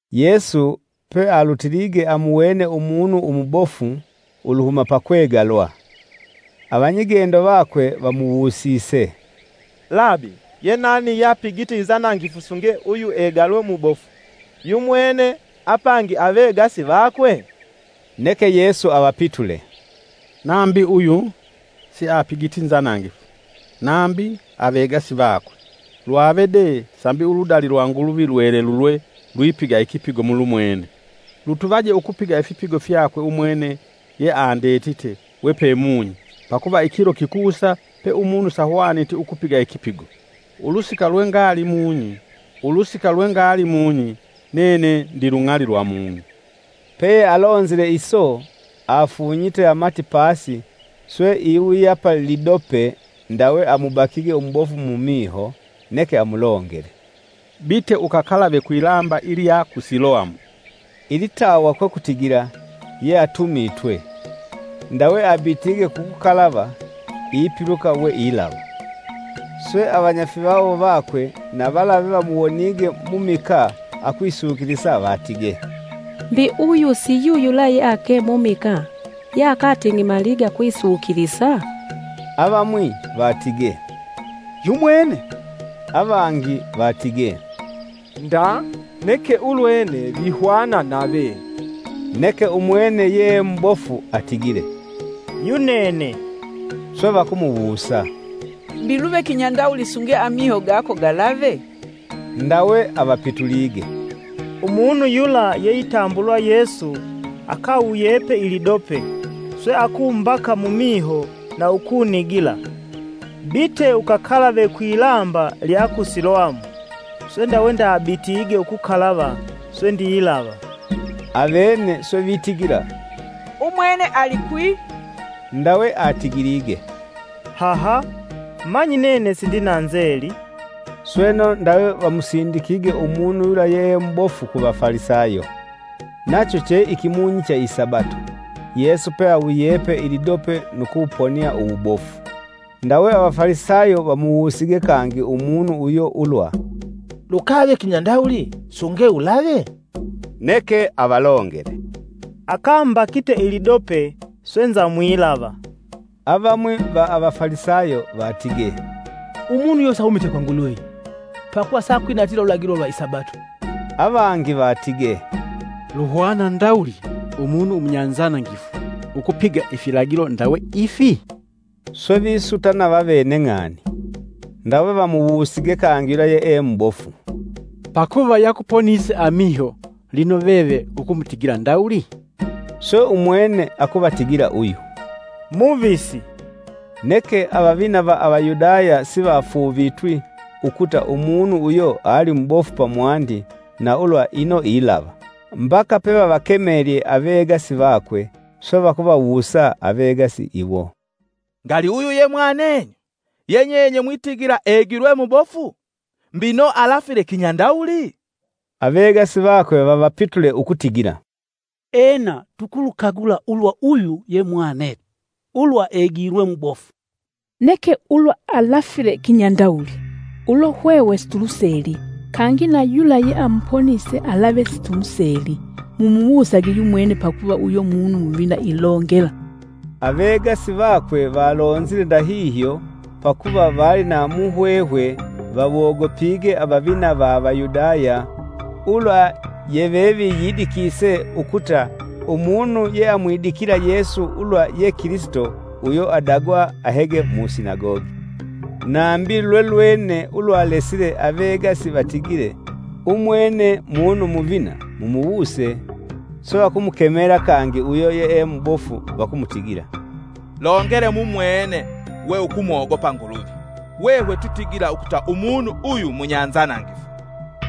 Yesu pealutilige amuwene umunu umubofu uluhuma pakwegalwa. Avanyigendo vakwe vamuwusise, “Labi! Yenani yeapigite inzanangifu sunge uyu egalwe mubofu yumwene apangi avegasi vakwe?” Neke Yesu avapitule, “Nambi uyu siapigiti nzanangifu, nambi avegasi vakwe. Lwave de sambi uludali lwa Nguluvi lwelelulwe lwipiga ikipigo mulumwene. Lutuvaje ukupiga ifipigo fyakwe umwene yeandetite wepe munyi pakuva ikilo kikusa pe umunu sahwaniti ukupiga ikipigo. Ulusika lwengali mung'i, nene ndilung'ali lwa mung'i.” Peyealonzile iso, afunyite amati pasi swe iwuyapa lidope ndawe amubakige umubofu mumiho neke amulongele, “Bite ukakalave kwilamba ilya ku Siloamu.” (ilitawa kwekutigila, “Yeatumitwe.”). Ndawe abitige kukukalava, ipiluka we ilava. Swe, avanyafivawo vakwe na vala vevamuwonige mumikaa akwisukilisa vatige, “Mbi uyu si yuyula yeake mumikaa yeakateng'emalige akwisukilisa?” Avamwi vatige, “Yumwene!” Avangi vatige, “Nda, neke ulwene vihwana nave!” Neke umwene yee mubofu atigile, “Yunene!” Swe vakumuwusa, “Mbi luve kinyandawuli sunge amiho gako galave?” Ndawe avapitulige, “Umunu yula yeitambulwa Yesu akawuyepe ilidope, swe akumbaka mumiho na ukunigila: ‘Bite ukakalave kwilamba lya ku Siloamu.’ Swe ndawe ndabitige ukukalava swe ndilava.” Avene swe vitigila umwene, “Alikwi?” Ndawe atigilige, “Haha! Manyi nene sindina nzeli!”. Sweno ndawe vamusindikige umunu yula yeemubofu Avafalisayo. Nacho che ikimunyi cha isabato, Yesu peawuyepe ilidope nu kuwuponia uwubofu. Ndawe Avafalisayo vamuwusige kangi umunu uyo ulwa, “Lukave kinyandawuli sunge ulave?” Neke avalongele, “Akambakite ilidope swe nzamwilava.” Avamwi va Avafalisayo vatige, “Umunu uyo sahumiti kwa Nguluvi, pakuva siakwinatila ululagilo lwa isabato.” Avangi vitigile, “Luhwana ndawuli umunu umunyanzanangifu ukupiga ifilagilo ndawe ifi?” Swe visutana vavene ng'ani. Ndawe vamuwusige kangi yula yeemubofu, “Pakuva yakuponise amiho lino veve ukumutigila ndawuli?” Swe umwene akuvatigila uyu, “Muvisi.” Neke avavina va Avayudaya sivafuuvitwi ukuta umunu uyo ali mubofu pamwandi na ulwa ino ilava, mbaka pevavakemelye avegasi vakwe, swe vakuvawusa avegasi iwo, “Ngali uyu ye mwanenyu? Ye nyenye mwitigila egilwe mubofu? Mbino alafile kinyandawuli?” Avegasi vakwe vavapitule ukutigila, “Ena tukulukagula ulwa uyu ye mwanetu, ulwa egilwe mubofu. Neke ulwa alafile kinyandawuli, ulo hwehwe situluseli, kangi na yula yeamuponise alave situmuseli. Mumuwusage yumwene pakuva uyo munu muvina ilongela.” Avegasi vakwe valonzile ndahihyo pakuva vali na muhwehwe vawogopige avavina va Avayudaya ulwa yeveviyidikise ukuta umunu yeamwidikila Yesu ulwa ye Kilisito uyo adagwa ahege mu sinagogi. Nambi lwelwene ulwalesile avegasi vatigile, “Umwene munu muvina mumuwuse!” Swe vakumukemela kangi uyo yeemubofu vakumutigila, “Longele mumwene we ukumogopa Nguluvi! Hwehwe twitigila ukuta umunu uyu munyanzanangifu.”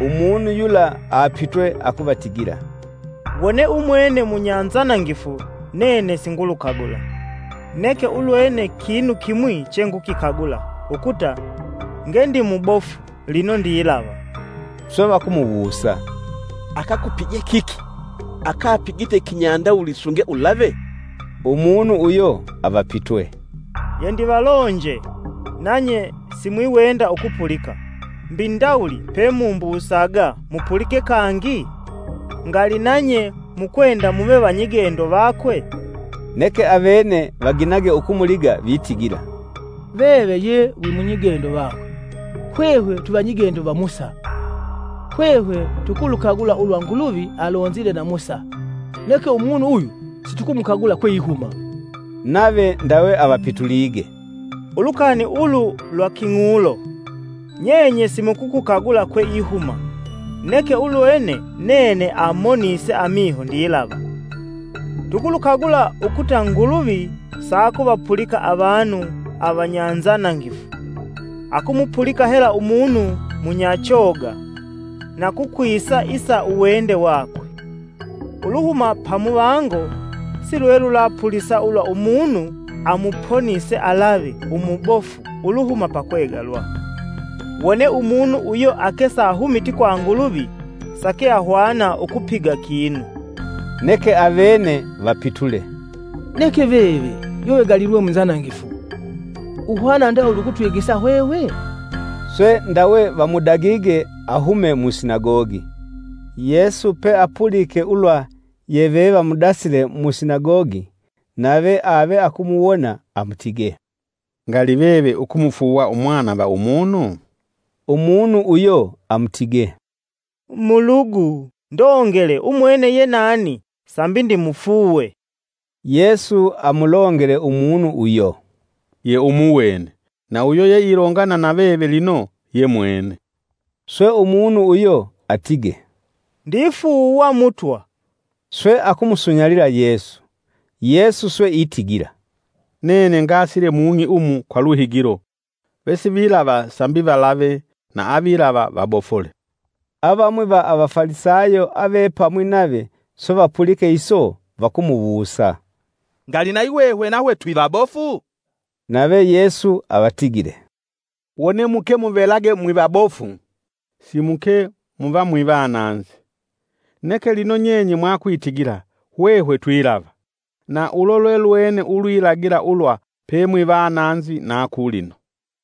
Umunu yula apitwe akuvatigila, “Wone umwene munyanzanangifu nene singulukagula. Neke ulwene kinu kimwi chengukikagula ukuta, “Nge ndimubofu lino ndilava.” Swe vakumuwusa, “Akakupije kiki? Akapigite kinyandawuli sunge ulave?” Umunu uyo avapitwe, “Yendivalonje nanye simwiwenda ukupulika; mbi ndawuli pemumbusaga mupulike kangi? Ngali nanye mukwenda muve vanyigendo vakwe?” Neke avene vaginage ukumuliga vitigila, “Veve ye wimunyigendo vakwe; hwehwe twivanyigendo va Musa. Hwehwe tukulukagula ulwa Nguluvi, alonzile na Musa, neke umunu uyu situkumukagula kweihuma!” Nave ndawe avapitulige, “Ulukani ulu lwa king'ulo! Nyenye simukukagula kweihuma neke ulwene nene amonise amiho ndilava. Tukulukagula ukuta Nguluvi sakuvapulika avanu avanyanzanangifu, akumupulika hela umunu munyachoga na kukwisa isa uwende wakwe. Uluhuma pamuvango silwelulapulisa ulwa umunu amuponise alave umubofu uluhuma pakwegalwa. Wone umunu uyo ake sahumiti kwa Nguluvi, sakeahwana ukupiga kinu!” Neke avene vapitule, “Neke veve, yewegalilwe munzanangifu. Uhwana ndawuli ukutwigisa hwehwe?” Swe ndawe vamudagige ahume mu sinagogi. Yesu peapulike ulwa yevevamudasile mu sinagogi, nave ave akumuwona amutige, “Ngali Veve ukumufuuwa umwana va umunu?” Umunu uyo amutige, “Mulugu ndongele umwene ye nani, sambi ndimufuuwe!” Yesu amulongele umunu uyo, “Ye umuwene, na uyo yeilongana na veve lino ye mwene.” Swe umunu uyo atige, “Ndifuuwa Mutwa!” Swe akumusunyalila Yesu. Yesu swe itigila, “Nene ngasile mung'i umu kwa luhigilo, vesivilava sambi valave na avilava vabofule.” Avamwi va Avafalisayo avepamwi nave swe vapulike iso, vakumuwusa, “Ngali nayi hwehwe nahwe twivabofu?” Nave Yesu avatigile, “Wone muvelage mwivabofu, simuke muva mwivananzi. Neke lino nyenye mwakwitigila: ‘Hwehwe twilava’, na ulo lwelwene ulwilagila ulwa pemwivananzi na kulino.”